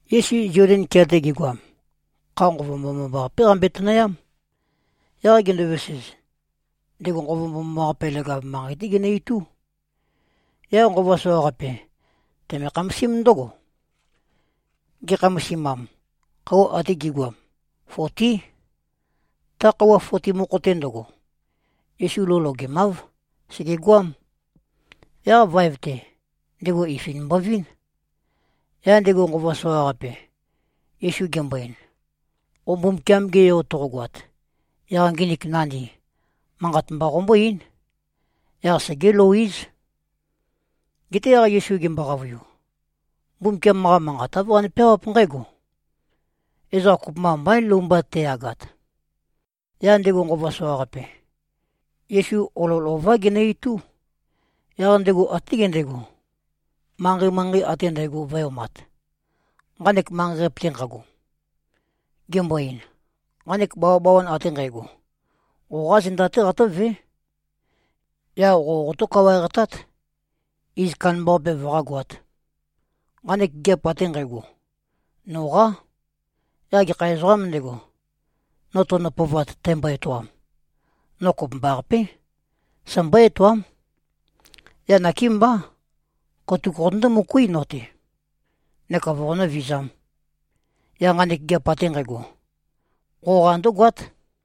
Yesu Zoden kea-te gegoam, kha Nqova Mbomambaqapé qambøe-tønøyám. Yaq gendovesez, ndego Nqova Mbomambaqape, leg-av manqei-té genø-itú. Yaq nqova soqaqape, teme-khamasím ndǿgo. Ge꞉khamasimam, khøuwa ate gi꞉goam, fotí. Ta khøuwa foti mokho-te ndøgo, Yesu lou logemáv. Sègegoám. Yaq vaev-te, ndego ifi mbovín. Yaq ndego nqova soqaqape, Yesu gembo-ein, “Qo Mbumbukiam-ge Yo toqogoat, yaq nginik nandi, manqat mba qombó-eín. Yaq segé-lou-éz.” Geté yaq Yesu gembo-qavøiu, “Mbumbukiam-qa Manqat āv qane-peawáp nqǽgo, ‘Ezoqa kopømba mbaín, lou mba te꞉yagat.’” Yaq ndego nqova soqaqape, Yesu olol ová genø-itú. Yaq ndego até gendegó, manqei-manqei ate ndægo vø̄e-omat, nqanek manqei-qape-te nqago, gembo-ein, “Nqanek bawabawan ate nqægo, qoqá zenda-té qatǿvé. Yaq qō qotó-kawaeqtát, iz kandambaqape vøqágoāt. Nqanek gigiap ate nqægo, noqá. Yaq gekha ezoqām ndego, no tønø-pøovat, tæmbo-etoam, no kopømbaqapé, sæmbó-etoám. Yaq nakémbá, katuk qotøndó-møkuí no-te, neka voqonǿ-vizām, yaq nqanek gigiap ate nqægo, qoqa ndǿgoát.”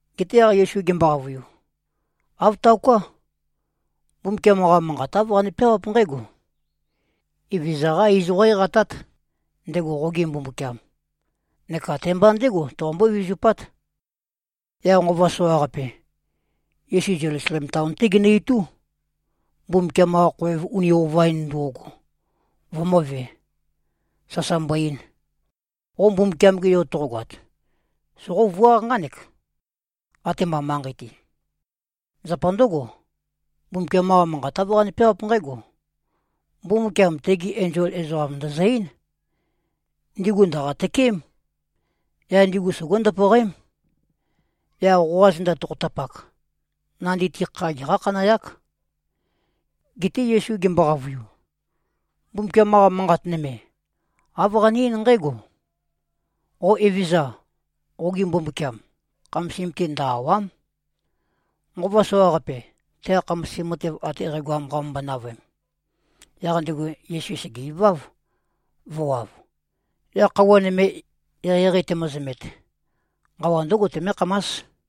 Geté yaq Yesu gembo-qavøiu, “Āv taoká. Mbumbukiam-qa Manqat āv qane-peawáp nqǽgo: Evezøza-qá iz qó-eqatát, ndego qoge Mbumbukiam. Neka te-mba ndégo, toqombó-vizupát.” Yaq nqova soqaqape, Yesu Zelusalem taon-té genø-itú, Mbumbukiam-qa khoev uni ova-in ndo꞉go vømø̄ve, sasa mbo-ein, “Qo Mbumbukiam-ge Yo toqogoat, soqóvuáq nqánek, atema manqei-te. Zapa ndǿgo, Mbumbukiam-qa Manqat āv qane-peawáp nqǽgo, ‘Mbumbukiam tegi enzol ezoqam ndø̀zø-eín. Ndigu ndø̀qa-tøkeém. Yaq ndigu sogó-ndøpøqém. Yaq qoqa zenda tokhotapak, nandi-te kha geqá-khanøyák.’” Geté Yesu gembo-qavøiu, “Mbumbukiam-qa Manqat nøme, āv qane-eín nqǽgo, ‘Qo Evezøza, qoge Mbumbukiam, khamasim-te ndø-àwa᷄m.’” Nqova soqaqape, teqa khamasim matev ate qægoam qamømbøe-navøem, yaq ndego Yesu sège-iváv, vø̄wav. Yaq khøuwa nøme eqeieqei temøzømet, nqawa ndǿgo temékhamás.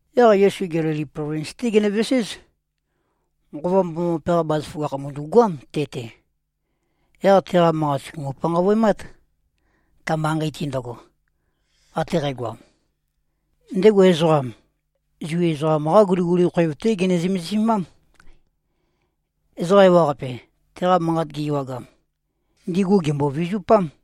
Yaq Yesu Gelili plovins-té genøveséz. Nqova Mbomambaqape-qa bazaføgakh, mø̀ndu꞉goám te-te. Yaq teqa manqat sùgumu-panqavøemát, ta manqei-te ndøgo, ate qægoam. Ndego, ezoqam, Zu ezoqam-qá guliguli khoev-té gene-zømesimám. Ezoqa ewaqape, teqa manqat gi-ewagam, ndigu gèmbo-vizupám.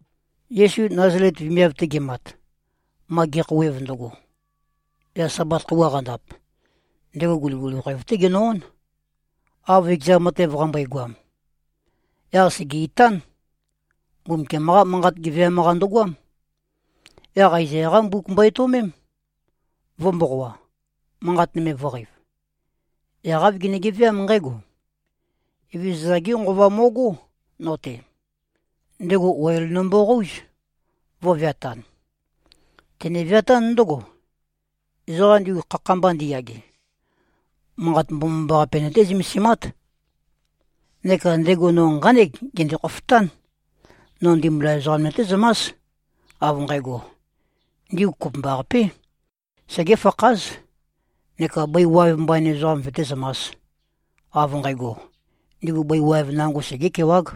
Yesu Nazalet vemiav-te gemat, ma ge꞉khouwev ndøgo, yaq Sabat khøuwa qandap, ndego guliguli khoev-té genø-ón, av ekeza matev qambøegoam. Yaq sège-itán. Mbumbukiam-qá Manqat geveam-qa ndøgoám. Yaq Aezaya-qá mbuk mbo-etøomém, vø̄-mboqoa, manqat nøme vø̄qeiv. Yaq āv gene-geveám nqǽgo, “Evezøza-gé Nqova mo꞉gó, no-te. Ndego oil nømboqóuz, vø̄veatan. Tene-veatán ndǿgo, ezoqa ndigu khakha-mba ndiyage, Manqat Mbomambaqape nøté-zømesimát. Neka ndego no nqánek gende-khofotán. No ndimbula ezoqam nøtézømás, av nqægo, ndigu kopømbaqapé, segéfakház, neka bøi waev mbain ezoqam vøtézømās, av nqægo, ndigu bøi nango segé꞉kewág.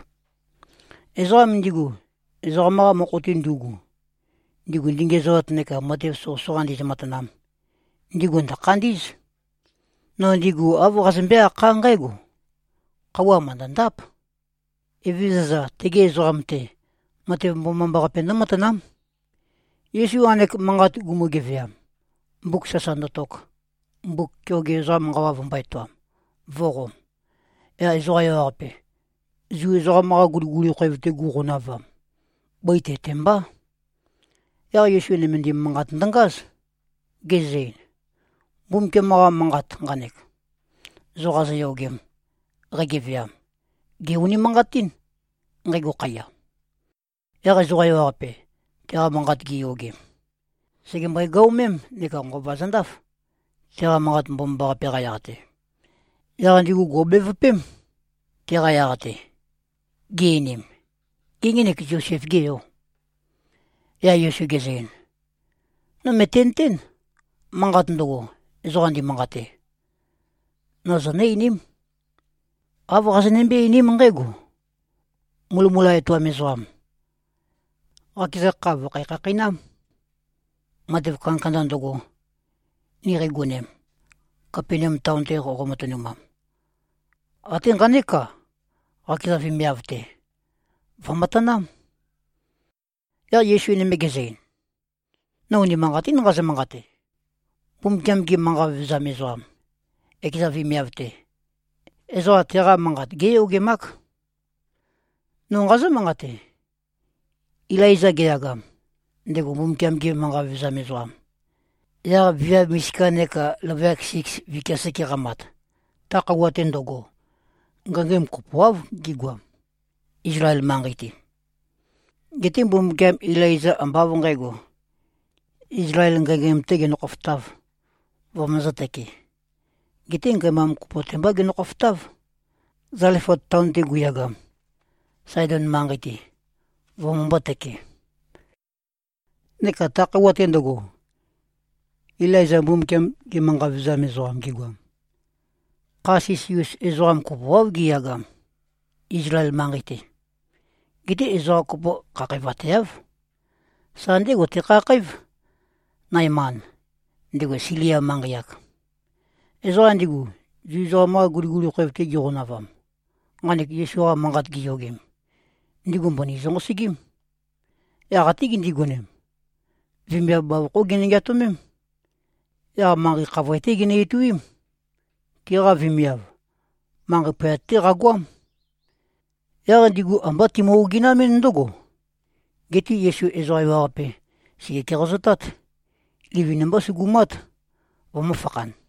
Ezoqam ndigu, ezoqam-qa mokho-te ndu꞉gu, ndigu ndingenezoat neka matev soqøsoqa ndizø-matanam, ndigu ndø̀khandí꞉z. No ndigu āv qazømbé-akhá nqǽgo, ‘Khøuwa mø̀ndøndáp. Evezøza tegi ezoqam-te, matev mbomambaqape ndǿmatanám.’” Yesu nqanek manqat gumu-geveam, mbuk sasa ndøtok, mbuk keoge ezoqam nqawa vømbō-etoam, vø̄qom, yaq ezoqa ewaqape, Zu ezoqam-qa guliguli khoev-te gu꞉qonavam, bøi te-te mbá. Yaq Yesu nømendim manqat ndøngáz, gezø-ein, “Mbumbukiam-qa Manqat nqanek, zo qazoyogem, qægeveam, gè-unimanqatín, nqægo khaiya.” Yaq ezoqa ewaqape, teqa manqat giyogem, sègembøe-gøomém neka nqova zøndáf, teqa manqat mbomambaqape-qa yaq-te. Yaq ndigu gò꞉bevøpém, teqa yaq-te, gi-einim, “Gê, ngenek Zosef-gê yò?” Yaq Yesu gezø-ein, “No mø̀tenøtén. Manqat ndøgo, ezoqa ndimanqate, no zonǿ-einím. Āv qazonømbé-einím nqǽgo, ‘Mulømula etoam ezoqam, qakeza kha vø̀khæ-khakheinám. Matev kandakanda ndøgo, ni qeiyogem, Kapenaum taon-te qoqo-matønumam, até nqanék-a, qakeza vemiav-te, vø̀matanám.’” Yaq Yesu nøme gezø-ein, “No unimanqatín nqazø-manqate. Mbumbukiam-ge manqa vevezam ezoqam, ekeza vemiav-te, ezoqa teqa manqat géyogemák. No nqazǿ-manqate: Ilaiza geyagam, ndego Mbumbukiam-ge manqa vevezam ezoqam, yaq viav misika neka løvøyak siks vikia seke qamat, ta khøuwa-te ndøgo, ngængæm kopoáv gigoam, Izlael manqei-te. Geté Mbumbukiam Ilaiza ambá av nqǣgo, Izlael ngængæm-tē genø-khofotāv, vømøzǿ-tøkē. Geté ngæmam kopo-te mbá genø-khofotáv, Zalefat taon-te guyagam, Saedon manqei-te, vømømbō-tøke. Neka ta khøuwa-te ndøgo, Ilaiza Mbumbukiam-ge manqa vevezam ezoqam gegoam, kha sisi-us ezoqa kopoáv giyagam, Izlael manqei-te. Geté ezoqa kopo khakhævateáv. Sa ndégo tekhakhǽv, Naeman, ndego Silia manqei-ak.” Ezoqa ndigu, Zu ezoqam-qa guliguli khoev-te giqonavam, nqanek Yesu-qa manqat giyogem, ndigu mbøni zønqosøgím. Yaq até gindigonem, vemiav bavokhó ginø-ngeatømém. Yaq manqei khavoe-té ginø-ituím. Tiqa vemiav, manqei poyat-té qagoám. Yaq ndigu ambá timø-oginamɨ́n ndǿgo. Geté Yesu ezoqa ewaqape, sège-keqazotát. Livin-mbá sugumát, vømø̄fakhan.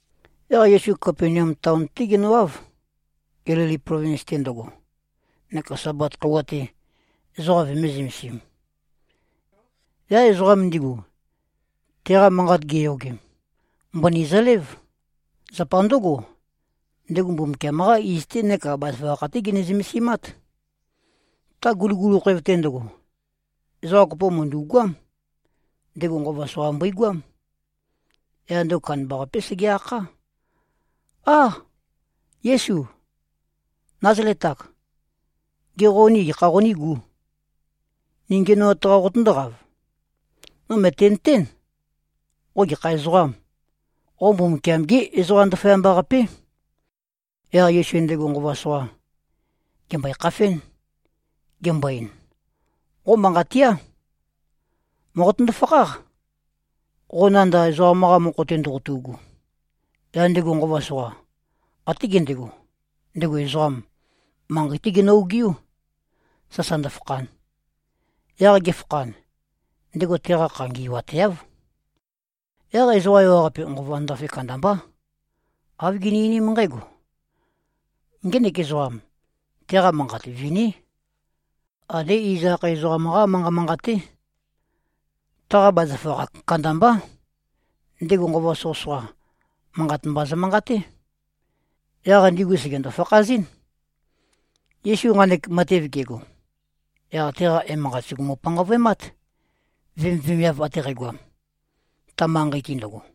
Yaq Yesu Kapenaum taon-té genøwáv, Gelili plovins ndøgo, neka Sabat khøuwa-te, ezoqa vømē-zømesim. Yaq ezoqam ndigu, teqa manqat giyogem, mbøni zølév. Zapa ndǿgo, ndego Mbumbukiam-qá iz-té neka bazaføgakh-té gene-zømesimát. Ta guliguli khoev-te ndøgo, ezoqa kopo mø̀ndu꞉goám. Ndego nqova soqa mbøigoám. Yaq ndego kandambaqapé sege-akhá, “Â? Yésu, Názalet-ak! Gê, qo ni gekha qonígū? Ni ngiænoat-qā qotøndóqav? No mø̀tenøtén, qo gekha ezoqām. Qo Mbumbukiam-gé Ezoqa Ndaføyamba-qapé.” Yaq Yesu ndego nqova soqa, gèmbøe-khafén, gembo-ein, “Qo manqat tía! Mòqotøndo-fakháq, qo nanda ezoqam-qa mokho-te ndoqotu꞉gu.” Yaq ndego nqova soqa, até gendego, ndego ezoqam, manqei-té genø-ogiú, sasa ndøfakhan. Yaq ge꞉fakhan, ndego teqa kha ngi꞉wateáv. Yaq ezoqa ewaqape nqova ndafe kandambá. Āv gini-einím nqǽgo, “Ngenek ezoqam. Teqa manqat viní. Andé iz akhae ezoqam-qá manqa manqaté. Taqa bazaføgakh kandambá. Ndego nqova soqøsoqa, manqat mba zømanqaté. Yaq ndigu sègendo-fakhazɨ́n.” Yesu nqanek matev gego, yaq teqa emanqat sùgumu-panqavøemát, vemivemiav ate qægoam, ta manqei-te ndøgo.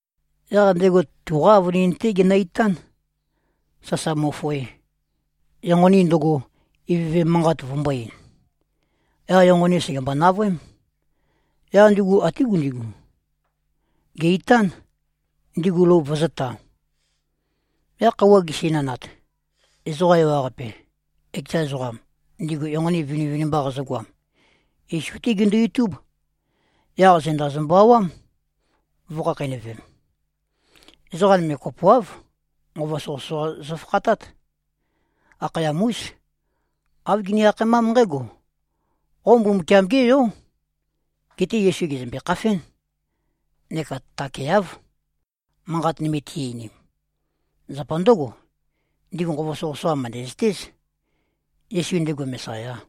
Yaq ndego tuqá avønin-té genø-itán, sasa mo꞉foe, enqoni ndøgo, ivøve manqat vømbō-ein. Yaq enqoni sègembo-navøém. Yaq ndugu até gundigu, gè-itán, ndigu lou vøzø̄ta. Yaq khøuwa gesinanat, ezoqa ewaqape, ekeza ezoqam, ndigu enqoni vinivinimba qazøgoam, Yesu-té gindu-itúb. Yaq zenda zømbø-awám, vø̄khakheinøvem. Ezoqa nøme kopoáv, nqova soqøsoqa zøfakhatát. Akhayam-ús. Āv gini-akhaemám nqǽgo, “Qo Mbumbukiam-gé Yó!” Geté Yesu gèzømbe-khafén neka takeáv, manqat nøme ti-einim. Zapa ndǿgo, ndigu nqova soqøsoqa mø̀ndæzøtéz, Yesu, ndego Mesayā.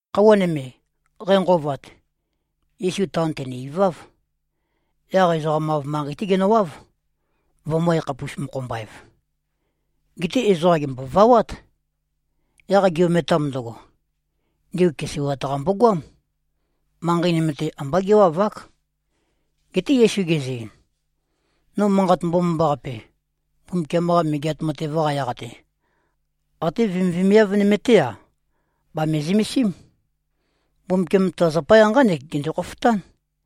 Khøuwa nøme, qænqøovat, Yesu taon tène-iváv. Yaq ezoqam-av manqei-té genøwáv, vømø̄-yakhapus-mokho-mba-ev. Geté ezoqa gèmbovawát. Yaq gi-ometam ndøgo, ndigu keseiwat-qa mbogoám. Manqei nøme-te, ambá géwavák. Geté Yesu gezø-ein, “No Manqat Mbomambaqape, Mbumbukiam-qa Megeat Matev-qa yaq-te, até vemivemiav nøme-té-a, bàme-zømesím. Mbumbukiam ta zapaya nqánek gende-khofotán.”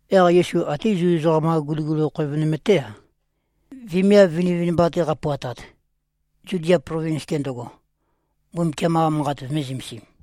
Yaq Yesu até Zu ezoqam-qa guliguli khoev nøme-té-a, vemiav vinivinimba-te qapuatat, Zudia plovins-te ndøgo, Mbumbukiam-qa Manqat vømē-zømesim.